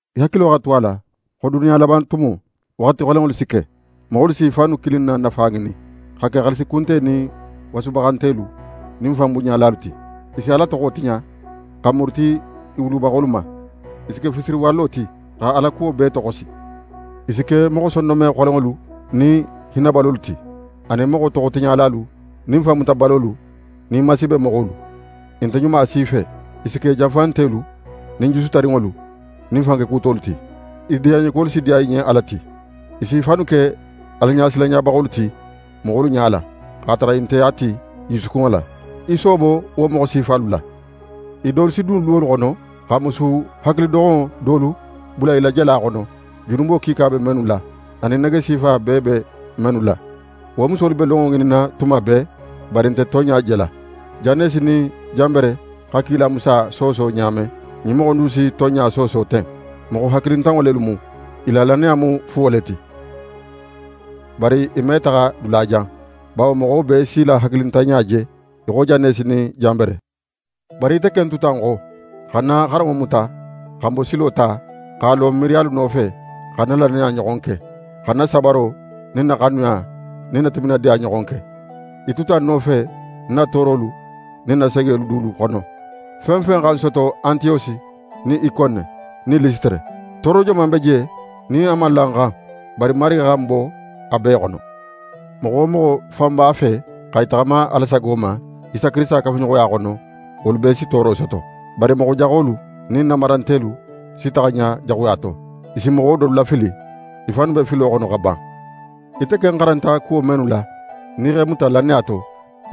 Í hakilo xa tu a la xo duniya laban tumo, waxati xolenŋolu si ke. Moxolu s'i fannu kilin na nafa ŋinin, xa ke xaalisi kunte nin wasubaxantelu nin fanbunɲalalu ti. I si Ala toxo tiɲa, xa muruti i wulubaxolu ma. I si ke fisiriwalo ti, xa Alakuwo bee toxosi. I si ke moxo sondonme xolenŋolu nin hinnabalolu ti, anin moxo toxotiɲalalu nin fanmutabalolu nin masiibemoxolu. I nte ɲuma si fe. I si ke janfantelu nin jusu tarinŋolu nin fankekutolu ti. I diyanɲekuwolu si diya i ɲen Ala ti. I s'i fannu ke Alaɲasilanɲabaxolu ti moxolu ɲala, x'a tara i nte a ti i jusukunŋo la. Í soobo wo moxo sifalu la. I dolu si dun luwolu xono, xa musu hakilidoxonŋo dolu bula i la jala xono, junubo kiika be mennu la, anin nege sifa bee be mennu la. Wo musolu be lonŋo ŋininna tuma bee, bari i nte tonɲa jela. Janesi nin Janbere xa kila Musa sooso ɲa men, ɲin moxo in dulu si tonɲa sooso ten. Moxo hakili tiɲaninŋo lelu mu. I la lannaya mu fuwo le ti. Bari i me taxa dulajan, bawo moxo bee s'i la hakilintanɲa je, í xo Janesi nin Janbere. Bari ite ken tuta ń xo, xa ń na xaranŋo muta, xa ń bosilo ta, x'a lo ń miiriyalu nofe, xa ń na lannaya ɲoxon ke, xa ń na sabaro nin ń na xanuya nin ń na timinadiya ɲoxon ke. Í tuta ń nofe ń na toorolu nin ń na segelu dulu xono, fen fen xa ń soto Antiyosi nin Ikone nin Lisitere. Tooro joman be je nin a man la ń xan? Bari Marigi xa ń bo a bee xono. Moxo wo moxo fan b'a fe xa í taxama Ala sago ma, Isa Kirisita kafuɲoxoya xono, wolu bee si tooro soto. Bari moxo jaxolu nin nanbarantelu si taxa ɲa jaxuya to. I si moxo dolu lafili. I fannu be filo xono xa ban. Ite ken xaranta kuwo mennu la, nin í x'e muta lannaya to,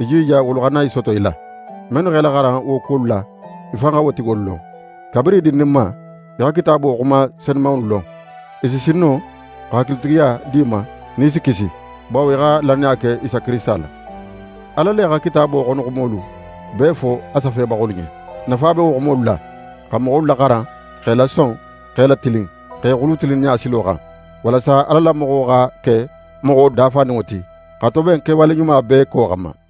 í jija wolu xana í soto í la. Mennu x'é laxaran wo kuwolu la, í fan xa wo tigolu lon. Kabirin í dindinma, í xa Kitaabo xuma senumanŋolu lon, i si sin no xa hakilitigiya di í ma nin í si kisi, bawo í xa lannaya ke Isa Kirisita la. Ala le xa Kitaabo xonoxumolu bee fo a safebaxolu ɲen. Nafa be wo xumolu la, xa moxolu laxaran, x'e lason, x'e latilin, x'e xulu tilinninɲa silo xan, walasa Ala la moxo xa ke moxo dafaninŋo ti, xa toben kewale ɲuma bee ko xanma.